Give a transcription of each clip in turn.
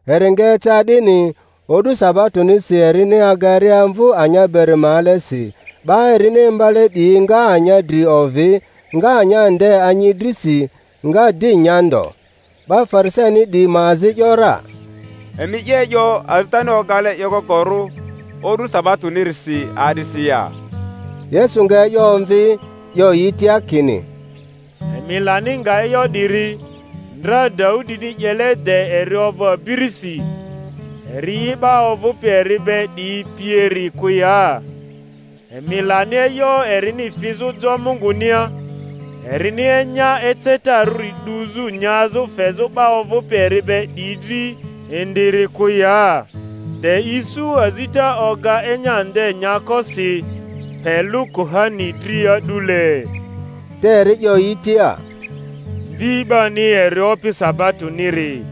Eri nga eca 'dini, o'du sabatonisi erini agaria amvu anya beri ma alesi, 'ba erini imbale 'diyi nga anya dri ovi, nga anya nde anyi drisi, nga di nya ndo. 'Ba Farisaini 'diyi ma azi ‘yora, Emi 'ye e'yo azitani ogale 'yekokorᴜ o'du sabatonisiri a'disi ya? Yesu nga e'yo omvi, 'yo yi tia kini, Emi lani nga e'yo 'diri, ndra Daudini 'yele de eri ovᴜ abirisi, eri'i 'ba ovᴜpi eri be 'diyi pieri kᴜ ya? Emi lani e'yo erini fizᴜ jo Mungunia, erini enya ecetarᴜri 'duzᴜ nyazᴜ fezᴜ 'ba ovᴜpi eri be 'diyi dri indiri kᴜ ya? de isu azita oga enya nde nyako si, pe lᴜ kuhani dri a'dule. Te eri 'yo yi tia, Mvi 'bani eri Opi sabatoniri.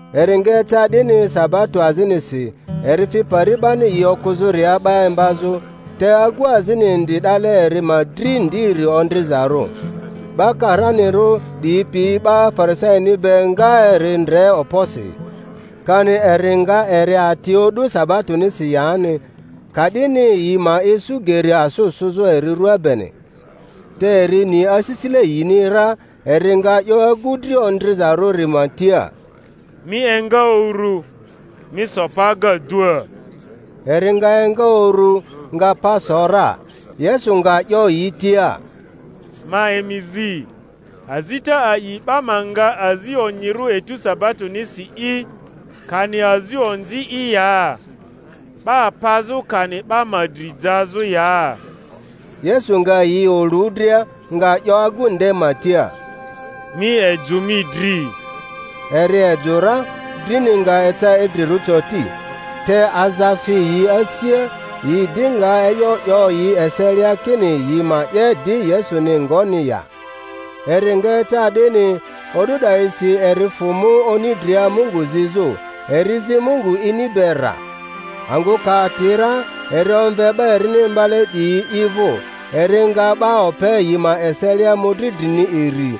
Eri nga eca 'dini sabato azinisi, eri fi pari 'bani yi okᴜzᴜria 'ba imbazᴜ, te agu azini indi 'dale eri ma dri ndiri ondrizarᴜ. 'Ba karanirᴜ 'diyi pi 'ba Farisaini be nga eri ndre okposi, kani eri nga eri ati o'du sabatonisi yani; ka'dini yi ma isu geri asᴜ sᴜzᴜ eri ruaa beni. Te eri ni asisile yini ra; eri nga 'yo agu dri ondrizarᴜri ma tia, Mi enga uru, mi so pa agadua. Eri nga enga uru, nga pa so ra. Yesu nga 'yo yi tia, Ma emi zi, azita a'i 'ba ma nga azi onyirᴜ etu sabatonisi'i, kani azi onzi'i ya? 'Ba pazᴜ kani 'ba ma dri jazᴜ ya? Yesu nga yi olu dria, nga 'yo agu nde ma tia, Mi ejᴜ mi dri. Eri ejᴜ ra, drini nga eca idrirᴜ coti. Te aza fi yi asia, yi di nga e'yo 'yo yi eselia kini yi ma 'ye di Yesuni ngoni ya. Eri nga eca 'dini, o'du 'dayisi eri fᴜ mu oni dria Mungu zizᴜ; eri zi Mungu ini be rra. Angᴜ ka ati ra, eri omve 'ba erini imbale 'diyi i vᴜ, eri nga 'ba ope yi ma eselia mᴜdri drini iri,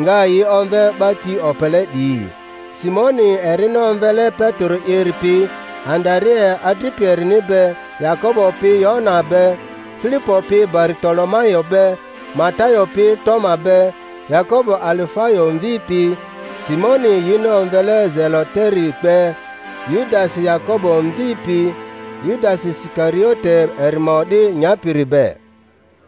nga yi omve 'ba ti opele 'diyi: Simoni erini omvele Petero'iri pi, Andarea adripi erini be, Yakobo pi Yohana be, Filipo pi Baritolomayo be, Matayo pi Toma be, Yakobo Alifayo mvi pi, Simoni yini omvele Zeloteri be, Yudasi Yakobo mvi pi, Yudasi Isikariote eri ma o'di nyapiri be.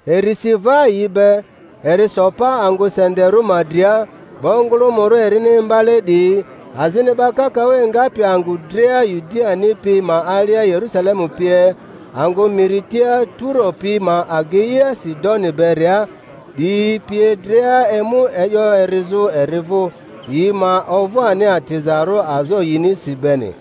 Eri si va yi be, eri so pa angᴜ senderᴜ ma dria, 'ba ongᴜlᴜmᴜrᴜ erini imbale 'diyi, azini 'ba kakaᴜ engapi angᴜ dria Yudiani pi ma alia Yerusalemu pie, angᴜ miri tia Turo pi ma ageia Sidoni beria 'diyi pie dria emu e'yo erizᴜ eri vᴜ, yi ma ovᴜ ani atizarᴜ azo yinisi beni;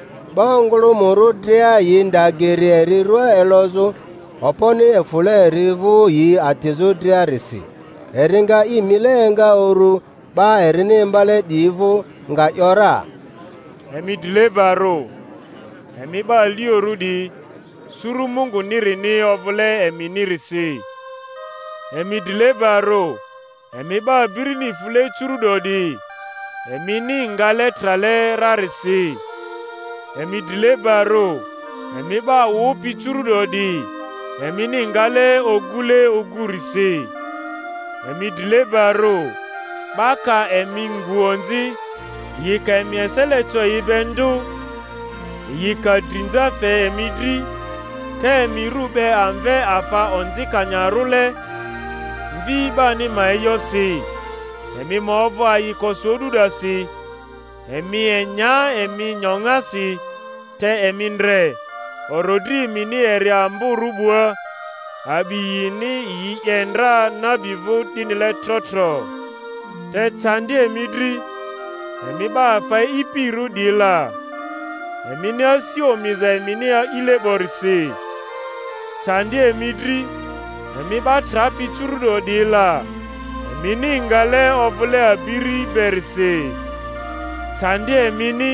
'Ba ongᴜlᴜmᴜrᴜ dria yi nda geri eri rua elozᴜ, okponi efᴜle eri vᴜ yi atizᴜ driarisi. Eri nga i mile enga uru 'ba erini imbale 'diyi vᴜ, nga 'yo ra: Emi drilebarᴜ, emi 'ba aliorᴜ 'diyi, suru Mungunirini ovᴜle eminirisi. Emi drilebarᴜ, emi 'ba abirini fule curu'do 'diyi, emini ngale trale rarisi. Emi drilebarᴜ, emi 'ba wᴜpi curu'do 'diyi, emini ngale ogule ogurisi. Emi drilebarᴜ, 'ba ka emi ngu onzi, yi ka emi esele co yi be ndᴜ, yi ka drinza fe emi dri, ka emi rᴜ 'be amve afa onzikanyarᴜle, Mvi 'bani ma e'yosi. Emi ma ovᴜ ayikosi o'du 'dasi, emi enya emi nyoŋasi, te emi ndre, orodri emini eri amborᴜ 'bua; a'bi yini yi 'ye ndra nabi vᴜ 'dinile trotro. Te candi emi dri, emi 'ba afa e'ipirᴜ 'diyi la, emini asi omiza emini a'ile 'borisi. Candi emi dri, emi 'ba trapi curu’do 'diyi la, emini ngale ovᴜle abiri berisi. Candi emini,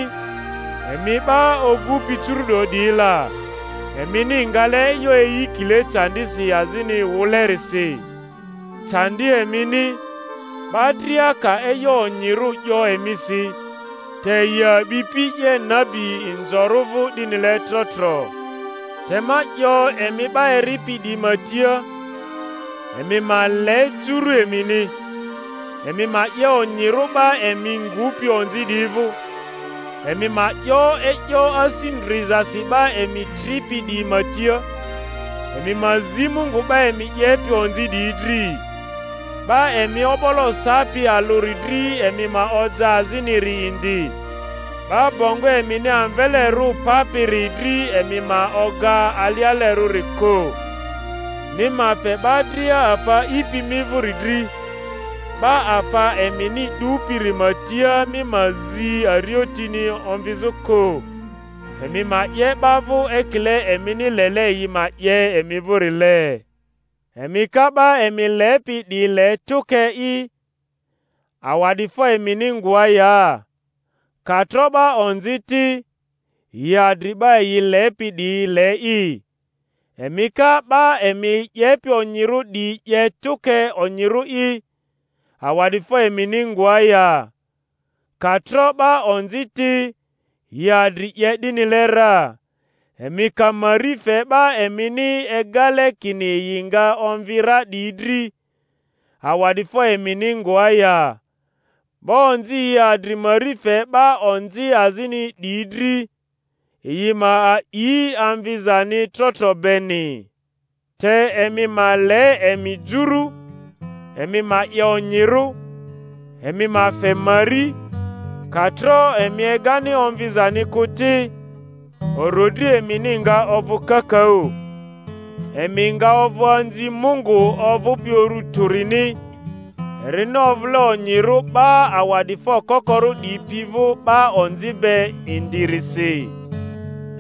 emi 'ba ogupi curu'do 'diyi la, emini ngale e'yo eyikile candisi azini wᴜlerisi. Candi emini, 'ba dria ka e'yo onyirᴜ 'yo emisi, te yi a'bipi 'ye nabi inzorᴜ vᴜ 'dinile trotro. Te ma 'yo emi 'ba eripi 'diyi ma tia, Emi ma le juru emini, emi ma 'ye onyirᴜ 'ba emi ngupi onzi 'diyi vᴜ, emi ma 'yo e'yo asi ndrizasi 'ba emi tripi 'diyi ma tia, emi ma zi Mungu 'ba emi 'yepi onzi 'diyi dri. 'Ba emi o'bolo sapi alᴜri dri emi ma oja aziniri indi; 'ba bongo emini amvelerᴜ papiri dri emi ma oga alialerᴜri kᴜ. Mi ma fe 'ba dria afa a'ipi mi vᴜri dri; 'ba afa emini 'dupiri ma tia, mi ma zi ariotini omvizᴜ kᴜ. Emi ma 'ye 'ba vᴜ ekile emini lele yi ma 'ye emi vᴜrile. Emi ka 'ba emi lepi 'diyi le tᴜke'i awa'difo emini ngoa ya? Ka tro 'ba onzi ti, yi adri 'ba yi lepi 'diyi le'i. Emi ka 'ba emi 'yepi onyirᴜ 'diyi 'ye tᴜke onyirᴜ'i, awa'difo emini ngoa ya? Ka tro 'ba onzi ti, yi adri 'ye 'dinile ra. Emi ka mari fe 'ba emini egale kini yi nga omvi ra 'diyi dri, awa'difo emini ngoa ya? 'Ba onzi yi adri mari fe 'ba onzi azini 'diyi dri, yi ma a'i amvi-zani trotro beni. Te emi ma le emi juru, emi ma 'ye onyirᴜ, emi ma fe mari, ka tro emi egani omvizani kᴜ ti; orodri emini nga ovᴜ kakaᴜ, emi nga ovᴜ anzi Mungu ovᴜpi Uru Tᴜrini; erini ovᴜle onyirᴜ 'ba awa'difo kokorᴜ 'diyi pi vᴜ 'ba onzi be indirisi.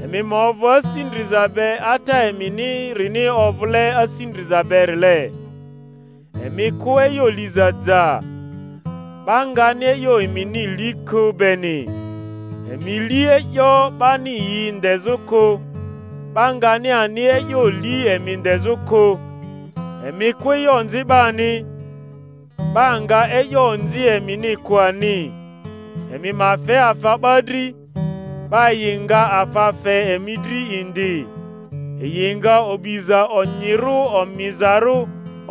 Emi ma ovᴜ asi ndriza be Ata eminirini ovᴜle asi ndriza berile. Emi kᴜ e'yo liza ja, 'ba ngani e'yo emini li kᴜ beni; emi li e'yo 'bani yi ndezᴜ kᴜ, 'ba ngani ani e'yo li emi ndezᴜ kᴜ; emi kᴜ e'yo onzi 'bani, 'ba nga e'yo onzi emini kᴜ ani; emi ma fe afa 'ba dri, 'ba yi nga afa fe emi dri indi; yi nga o'biza onyirᴜ, omizarᴜ,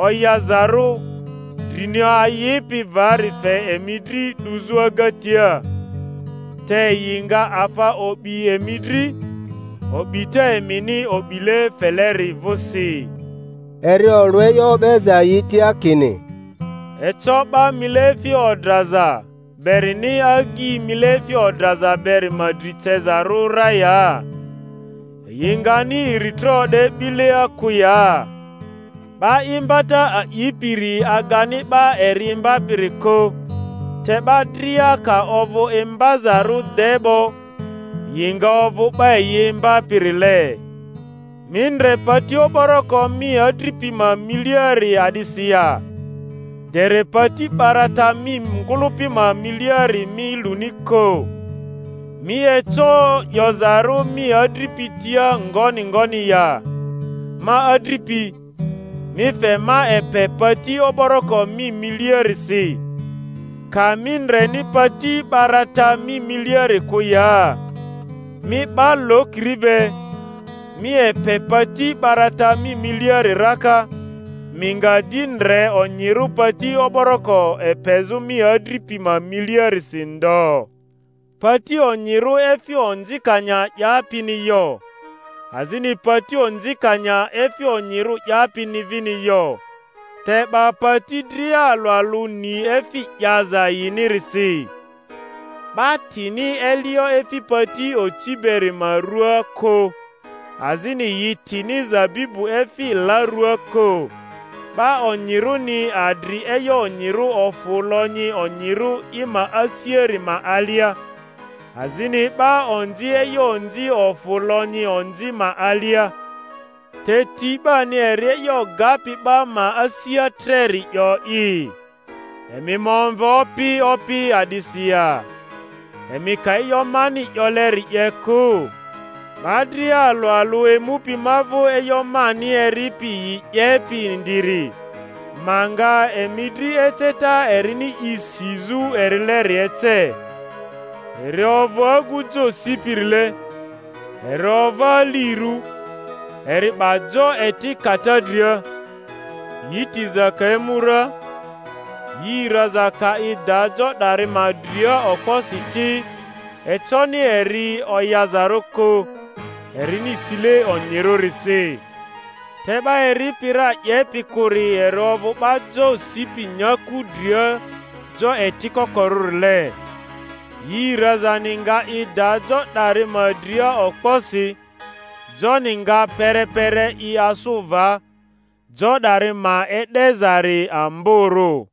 oyazarᴜ, drini ayipi vari fe emi dri 'duzᴜ agatia. Te yi nga afa o'bi emi dri.. o'bita emini o'bile feleri vᴜsi. Eri olᴜ e'yo o'beza yi tia kini: Eco 'ba mileefi odraza berini agyi mileefi odraza beri ma dri cezarᴜ ra ya? Yi ngani iritro o'de 'bilia kᴜ ya? 'Ba imbata a'ipiri agani 'ba eri imbapiri kᴜ, te 'ba dria, ka ovᴜ imbazarᴜ de 'bo, yi nga ovᴜ 'ba yi imbapirile. Mi ndre pati o'boroko mi adripi ma miliari a'disi ya, dere pati 'barata mi ngᴜlᴜpi ma miliari mi luni kᴜ? Mi eco 'yozarᴜ mi adripi tia ngoni ngoni ya, Ma adripi, mi fe ma epe pati o'boroko mi miliarisi, ka mi ndreni pati 'barata mi miliari kᴜ ya? Mi 'ba lokiri be, mi epe pati 'barata mi miliari raka, mi nga di ndre onyirᴜ pati o'boroko epezᴜ mi adripi ma miliarisi ndo. Pati onyirᴜ efi onzikanya 'yapini yo, azini pati onzikanya efi onyirᴜ 'yapini vini yo; te 'ba pati dria alᴜ alᴜ ni efi 'yaza yinirisi. 'Ba tini elio efi pati oci beri ma ruaa kᴜ, azini yi tini zabibu efi la ruaa kᴜ. 'Ba onyirᴜni adri e'yo onyirᴜ ofᴜ lonyi onyirᴜ i ma asiari ma alia, azini 'ba onzi e'yo onzi ofᴜ lonyi onzi ma alia; te ti 'bani eri e'yo gapi 'ba ma asia treri 'yo'i. Emi ma omve Opi, Opi, a'disi ya, emi ka e'yo mani 'yoleri 'ye kᴜ? 'Ba dria alᴜ alᴜ emupi ma vᴜ e'yo mani eripi yi 'yepi indiri, ma nga emi dri eceta erini i sizᴜ erileri ece: eri ovᴜ agu jo sipirile, eri ova alirᴜ, eri 'ba jo eti kata dria; yi tiza ka emu ra, yi raza ka i da jo 'dari ma dria okposi ti, econi eri oyazarᴜ kᴜ, erini sile onyirᴜrisi. Te 'ba eripi ra 'yepi kᴜri eri ovᴜ 'ba jo sipi nyaku dria jo eti kokorᴜrile; yi razani nga i da jo 'dari ma dria okposi, joni nga perepere i asᴜ va; jo 'dari ma e'dezari amborᴜ.